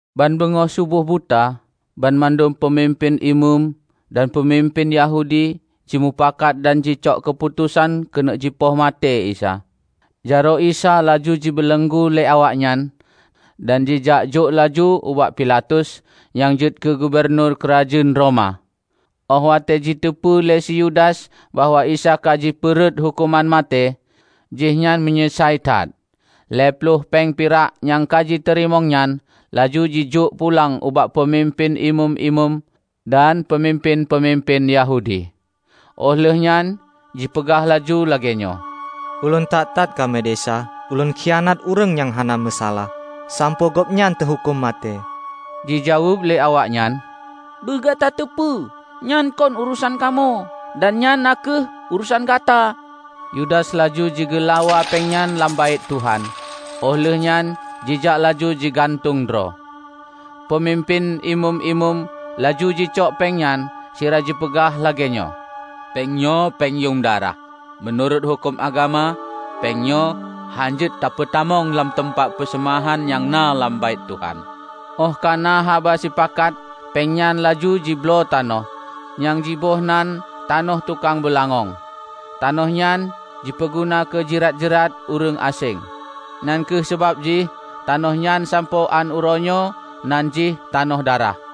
Ban beungoh seuboh buta, banmandum peumimpén Imeum dan peumimpén Yahudi jimupakat dan jicok keuputosan keuneuk jipoh maté Isa. Jaroe Isa laju jibeuleunggu lé awaknyan, dan jijak jok laju ubak Pilatus, nyang jeuet keu gubunur keurajeuen Roma. Óh watée jiteupeu lé si Yudas bahwa Isa ka jipeu rhot huköman maté, jihnyan meunyeusai that. Lhée ploh péng pirak nyang ka jiteurimong nyan laju jijok pulang ubak peumimpén Imeum-imeum dan peumimpén-peumimpén Yahudi. Óh lheueh nyan jipeugah laju lagée nyoe, "Ulôn that-that ka meudesya ulôn khianat ureuëng nyang hana meusalah, sampoe Gobnyan teuhuköm maté!" Jijaweueb lé awaknyan, "Beu gata teupeu, nyan kon urosan kamoe? Dan nyan na kheueh urosan gata!" Yudas laju jigeulawa péng nyan lam Baét Tuhan, óh lheueh nyan jijak laju jigantung droe. Peumimpén Imeum-imeum laju jicok péng nyan sira jipeugah lagée nyoe, "Péng nyoe péng yuem darah. Meunurot huköm agama, péng nyoe hán jeuet tapeutamong lam teumpat peuseumahan nyang na lam Baét Tuhan." Óh ka na haba sipakat, péng nyan laju jibloe tanoh nyang jiboh nan Tanoh Tukang Beulangöng. Tanoh nyan jipeuguna keu jirat-jirat ureuëng aséng. Nyang kheueh sabab jih tanoh nyan sampoe án uroe nyoe nan jih Tanoh Darah."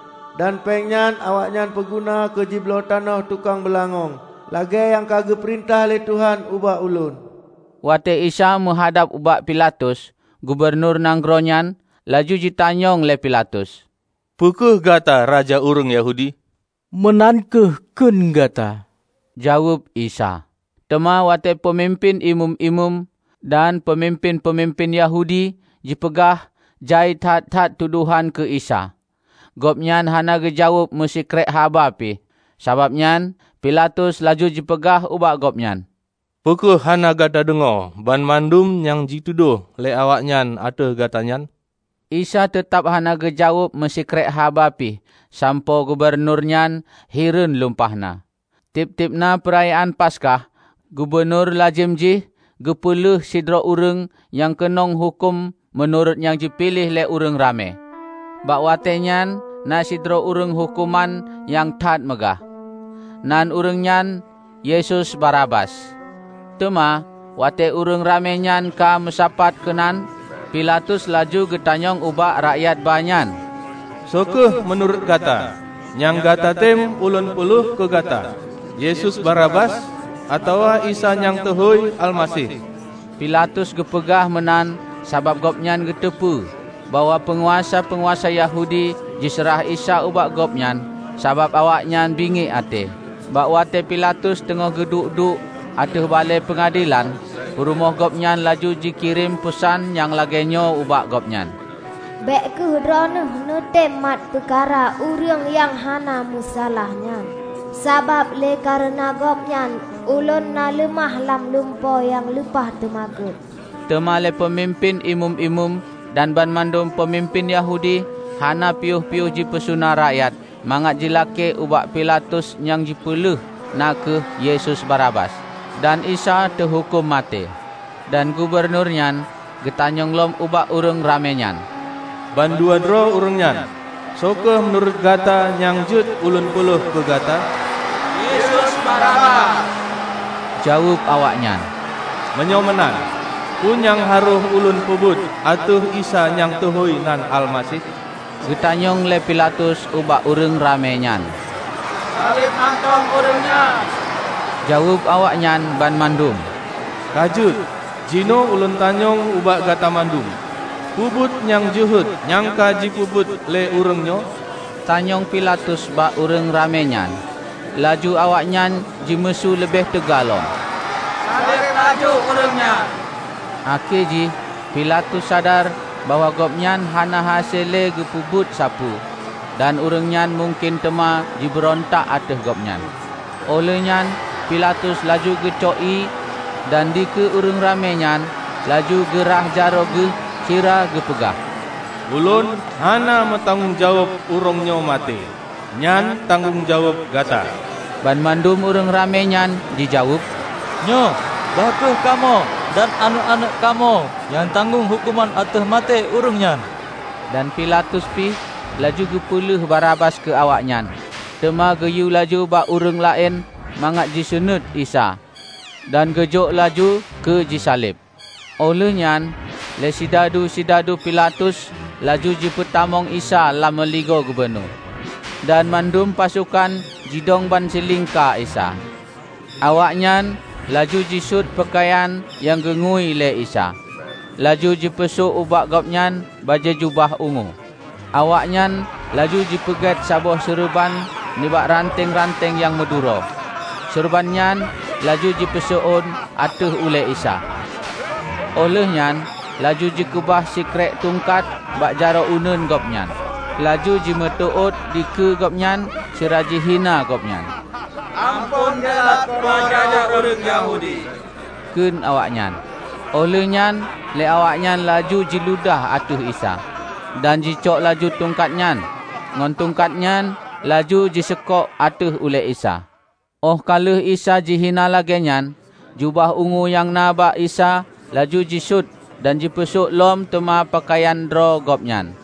Dan péng nyan awaknyan peuguna keu jibloe tanoh tukang beulangöng, lagée nyang ka geupeurintah lé Tuhan ubak ulôn." Watée Isa meuhadab ubak Pilatus, gubunur nanggroe nyan, laju jitanyong lé Pilatus, "Peu kheueh gata Raja ureuëng Yahudi?" "Meunan kheueh kheun gata," Jaweueb Isa. Teuma watée peumimpén Imeum-imeum dan peumimpén-peumimpén Yahudi jipeugah jai that-that tudohan keu Isa, Gobnyan hana geujaweueb meusikrek haba pih. Sabab nyan Pilatus laju jipeugah ubak Gobnyan, "Peu kheueh hana gata deungoe banmandum nyang jitudôh lé awaknyan ateueh gata nyan?" Isa teutab hana geujaweueb meusikrek haba pih sampoe gubunur nyan hireuen lumpah na. Tieb-tieb na Peurayaan Paskah, gubunur lazem jih geupeu lheueh sidroe ureuëng nyang keunong huköm meunurot nyang jipiléh lé ureuëng ramé. Bak watée nyan na sidroe ureuëng huköman nyang that meugah. Nan ureuëng nyan Yesus Barabas. Teuma, watée ureuëng ramé nyan ka meusapat keunan, Pilatus laju geutanyong ubak rakyat ba nyan, "Soe kheueh meunurot gata nyang gata tem ulôn peuleueh keu gata? Yesus Barabas atawa Isa nyang teuhôi Almaseh?" Pilatus geupeugah meunan sabab gobnyan geuteupeue bahwa peunguasa-peunguasa Yahudi jiseurah Isa ubak gobnyan sabab awaknyan bingiek até. Bak watée Pilatus teungoh geuduek-duek ateueh balée peungadelan, peurumoh gobnyan laju jikirém peusan nyang lagée nyoe ubak gobnyan, "Bék kheueh droeneueh neutem mat peukara ureuëng nyang hana meusalah nyan, sabab lé kareuna Gobnyan, ulôn na leumah lam lumpo nyang lumpah teumakot." Teuma lé peumimpén Imeum-imeum dan banmandum peumimpén Yahudi hana piôh-piôh jipeusuna rakyat mangat jilakée ubak Pilatus nyang jipeulheueh na kheueh Yesus Barabas dan Isa teuhuköm maté. Dan gubunur nyan geutanyong lom ubak ureuëng ramé nyan, "Ban dua droe ureuëng nyan, soe kheueh meunurot gata nyang jeuet ulôn peu lheueh keu gata?" "Yesus Barabas," jaweueb awaknyan. "Meunyoe meunan, peue nyang harôh ulôn peubuet ateueh Isa nyang teuhôi nan Almaseh?" Geu tanyong lé Pilatus ubak ureuëng ramé nyan. "Saleb mantong Ureuëng nyan!" jaweueb awaknyan banmandum. "Ka jeuet, jinoe ulôn tanyong ubak gata mandum, "Peue buet nyang jeuhet nyang ka jipeubuet lé ureuëng nyoe?" tanyong Pilatus bak ureuëng ramé nyan. Laju awaknyan jimeusu leubeh teuga lom, "Saleb laju Ureuëng nyan" Akhé jih Pilatus sadar bahwa gobnyan hana hase lé geupeubuet sapeue dan ureuëng nyan mungken teuma jibeurontak ateueh gobnyan. Óh lheueh nyan Pilatus laju geucok ié, dan dikeue ureuëng ramé nyan laju geu rhah jaroe geuh sira geupeugah, "Ulôn hana meutanggong jaweueb ureuëng nyoe maté, nyan tanggong jaweueb gata!" Banmandum ureuëng ramé nyan jijaweueb, "Nyoe, bah kheueh kamoe dan aneuëk-aneuëk kamoe nyang tanggong huköman ateueh maté Ureuëng nyan!" Dan Pilatus pih laju geupeuleueh Barabas keu awaknyan, teuma geuyue laju bak ureuëng laén mangat jiseunuét Isa; dan geujok laju keu jisaleb. Óh lheueh nyan lé sidadu-sidadu Pilatus laju jipeutamong Isa lam meuligoe gubunur, dan mandum pasokan jidong bansilingka Isa. Awaknyan laju jisuet peukayan nyang geungui lé Isa, laju jipeusok ubak Gobnyan bajée jubah ungu. Awaknyan laju jipeugét saboh seureuban nibak ranteng-ranteng nyang meuduro, seureuban nyan laju jipeuseuôn ateueh ulée Isa, óh lheueh nyan laju jikeubah sikrék tungkat bak jaroe uneuen Gobnyan, laju jimeuteuôt dikeue Gobnyan sira jihina Gobnyan. "Amphon delat po Raja Ureuëng Yahudi!" kheun awaknyan. Óh lheueh nyan lé awaknyan laju jiludah ateueh Isa, dan jicok laju tungkat nyan, ngon tungkat nyan laju jiseukok ateueh ulée Isa. Óh ka lheueh Isa jihina lagée nyan, jubah ungu nyang na bak Isa laju jisuet dan jipeusok lom teuma peukayan droe Gobnyan.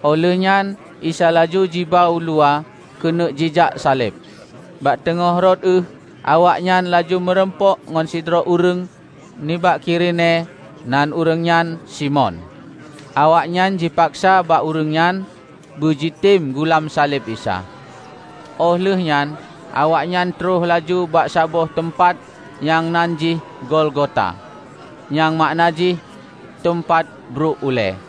Óh lheueh nyan Isa laju jiba uluwa keuneuk jijak saleb. Bak teungoh rot ueh awaknyan laju meurumpok ngon sidroe ureuëng nibak Kirine nan ureuëng nyan Simon. Awaknyan jipaksa bak ureuëng nyan beujitem gulam saleb Isa. Óh lheueh nyan awaknyan troh laju bak saboh teumpat nyang nan jih Golgota, nyang makna jih, "Teumpat Bruek Ulée",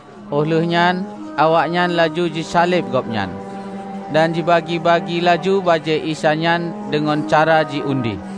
Óh lheueh nyan awaknyan laju jisaleb Gobnyan, dan jibagi-bagi laju bajée Isa nyan deungon cara ji undi.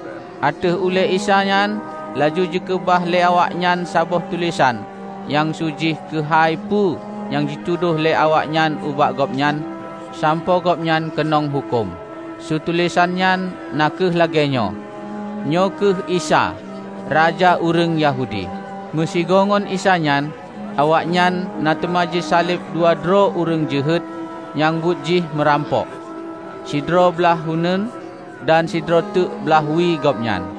Ateueh ulée Isa nyan laju jikeubah lé awaknyan saboh tulésan nyang su jih keuhai peue nyang jitudôh lé awaknyan ubak Gobnyan sampoe Gobnyan keunong huköm, su tulésan nyan na kheueh lagée nyoe: "Nyoe kheueh Isa, Raja Ureuëng Yahudi", Meusigoe ngon Isa nyan awaknyan na teuma jisaleb dua droe ureuëng jeuhet nyang buet jih meurampok; sidroe blaih uneuen, dan sidroe teuk blaih wie Gobnyan.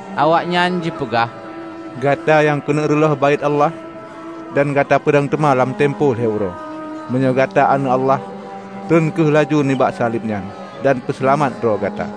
Awaknyan jipeugah, "Gata nyang keuneuk reuloh Baét Allah, dan gata peudong teuma lam teumpo lhée uroe! Meunyoe gata Aneuëk Allah, tron kheueh laju nibak saleb nyan, dan peuseulamat droe gata!"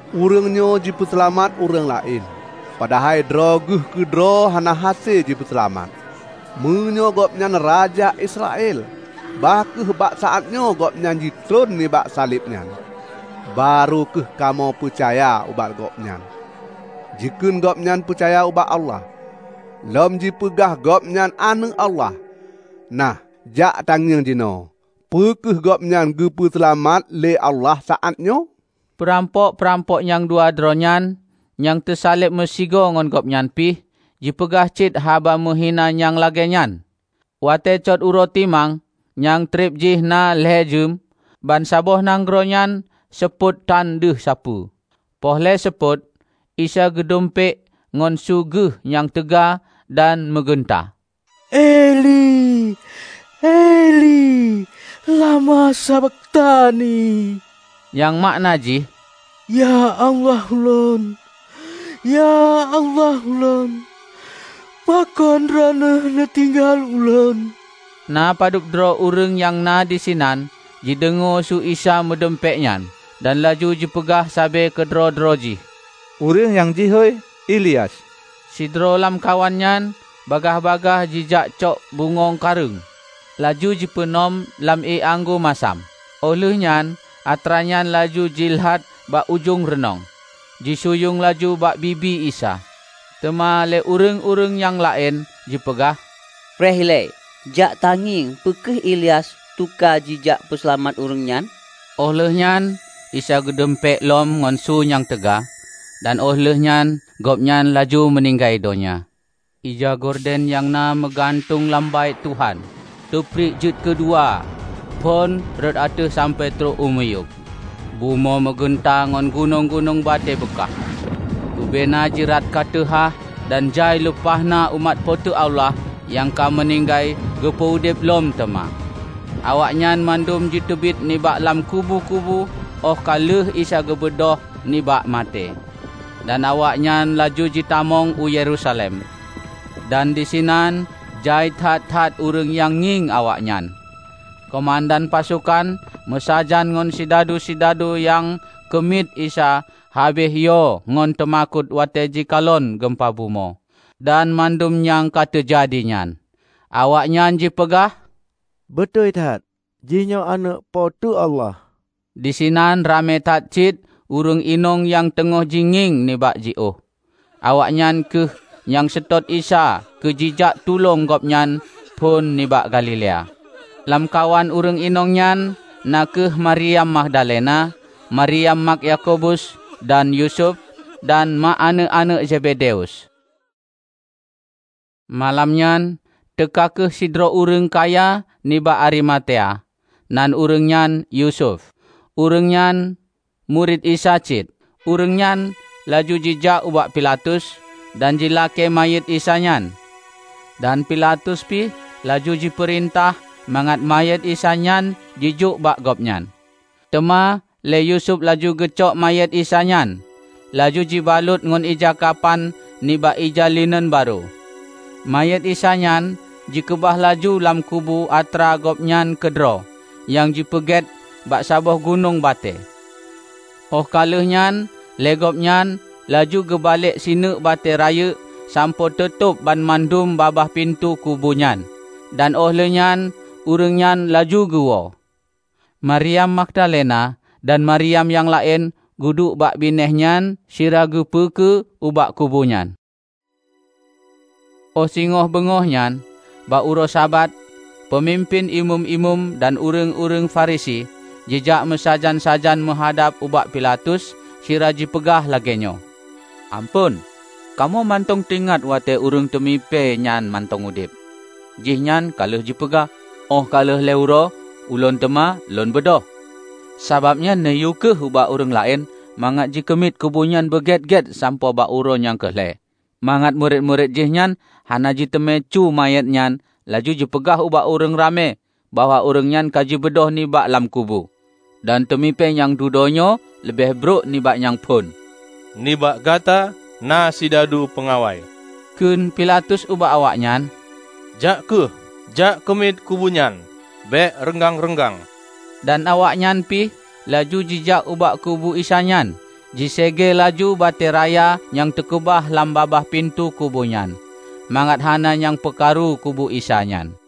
"Ureuëng nyoe jipeuseulamat ureuëng laén, padahai droe Geuh keudroe hana hase jipeuseulamat! Meunyoe Gobnyan raja Israel, bah kheueh bak saát nyoe Gobnyan jitron nibak saleb nyan, barô kheueh kamoe peucaya ubak Gobnyan. Jikheun Gobnyan peucaya ubak Allah, lom jipeugah Gobnyan Aneuëk Allah. Nah, jak tangieng jinoe, peu kheueh Gobnyan geupeu seulamat lé Allah saát nyoe." Peurampok-peurampok nyang dua droe nyan nyang teusaleb meusigoe ngon Gobnyan pih jipeugah cit haba meuhina nyang lagée nyan. Watée cot uroe timang, nyang treb jih na lhée jeuem, bansaboh nanggroe nyan seupôt tan deuh sapeue. Poh lhée seupôt, Isa geudumpék ngon su Geuh nyang teuga dan meugeunta, "Eli-eli, lama sabakhtani?" Nyang makna jih, "Ya Allah Lôn, ya Allah Lôn, pakon Droeneueh neutinggai Ulôn?" Na padub droe ureuëng nyang na disinan jideungoe su Isa meudumpék nyan, dan laju jipeugah sabe keudroe-droe jih, "Ureuëng nyang jihôi Ilyas!" Sidroe lamkawan nyan bagaih-bagaih jijak cok bungöng kareueng, laju jipeunom lam ié anggô masam. Óh lheueh nyan atranyan laju jilat bak ujong reunong, jisunyueng laju bak bibi Isa. Teuma lé ureuëng-ureuëng nyang laén jipeugah, "Preh ilée, jak tangieng peu kheueh Ilyas teuka jijak peuseulamat Ureuëng nyan!" Óh lheueh nyan Isa geudumpék lom ngon su nyang teuga, dan óh lheueh nyan Gobnyan laju meuninggai donya. Ija Gorden nyang na meugantung lam Baét Tuhan teupriek jeuet keudua phon rot ateueh sampoe trok u miyueb. Bumoe meugeunta dan gunong-gunong batée beukah. Bubena jirat ka teuhah, dan jai lumpah na umat Po teu Allah nyang ka meuninggai geupeu udeb lom teuma. Awaknyan mandum jiteubiet nibak lam kubu-kubu óh ka lheueh Isa geubeudôh nibak maté, dan awaknyan laju jitamong u Yerusalem. Dan disinan jai that-that ureuëng nyang ngieng awaknyan. Keumandan pasokan meusajan ngon sidadu-sidadu nyang keumiet Isa habéh yo ngon teumakot watée jikalon geumpa bumoe, dan mandum nyang ka teujadi nyan. Awaknyan jipeugah, "Beutôi that, jihnyoe Aneuëk Po teu Allah!" Disinan ramé that cit ureuëng inong nyang teungoh jingieng nibak jiôh. Awaknyan kheueh nyang seutôt Isa keu jijak tulông Gobnyan phon nibak Galilea. Lamkawan ureuëng inong nyan na kheueh Mariam Magdalena, Mariam mak Yakobus dan Yusuf, dan mak aneuëk-aneuëk Zebedeus. Malam nyan teuka kheueh sidroe ureuëng kaya nibak Arimatea, nan ureuëng nyan Yusuf. Ureuëng nyan murit Isa cit. Ureuëng nyan laju jijak ubak Pilatus, dan jilakée manyét Isa nyan, dan Pilatus pih laju jipeurintah mangat manyét Isa nyan jijok bak gobnyan. Teuma lé Yusuf laju geucok manyét Isa nyan, laju jibalot ngon ija kapan nibak ija lineun barô. Manyét Isa nyan jikeubah laju lam kubu atra gobnyan keudroe nyang jipeugét bak saboh gunong batée. Óh ka lheueh nyan lé gobnyan laju geubalek sineuk batée rayeuk sampoe teutob banmandum babah pintoe kubu nyan, dan óh lheueh nyan ureuëng nyan laju geuwoe. Mariam Magdalena dan Mariam nyang laén geuduek bak binéh nyan sira geupeukeue ubak kubu nyan. Óh singoh beungoh nyan, bak uroe Sabat, peumimpén Imeum-imeum dan ureuëng-ureuëng Farisi jijak meusajan-sajan meuhadab ubak Pilatus sira jipeugah lagée nyoe, "Amphon, kamoe mantong teuingat watée ureuëng teumipée nyan mantong udeb, jihnyan ka lheueh jipeugah, 'Óh ka lheueh lhée uroe Ulôn teuma Lôn beudôh.' Sabab nyan, neuyue kheueh ubak ureuëng laén mangat jikeumiet kubu nyan beugét-gét sampoe bak uroe nyang keu lhée, mangat murit-murit jihnyan hana jiteumé cue manyét nyan laju jipeugah ubak ureuëng ramé bahwa ureuëng nyan ka jibeudôh nibak lam kubu. Dan teumipée nyang dudoe nyoe leubeh brok nibak nyang phon." "Nibak gata na sidadu peungawai," kheun Pilatus ubak awaknyan, "Jak kheueh jak keumiet kubu nyan bék reunggang-reunggang." Dan awaknyan pih laju jijak ubak kubu Isa nyan, jiséegée laju batée raya nyang teukeubah lam babah pintoe kubu nyan, mangat hana nyang peukaru kubu Isa nyan.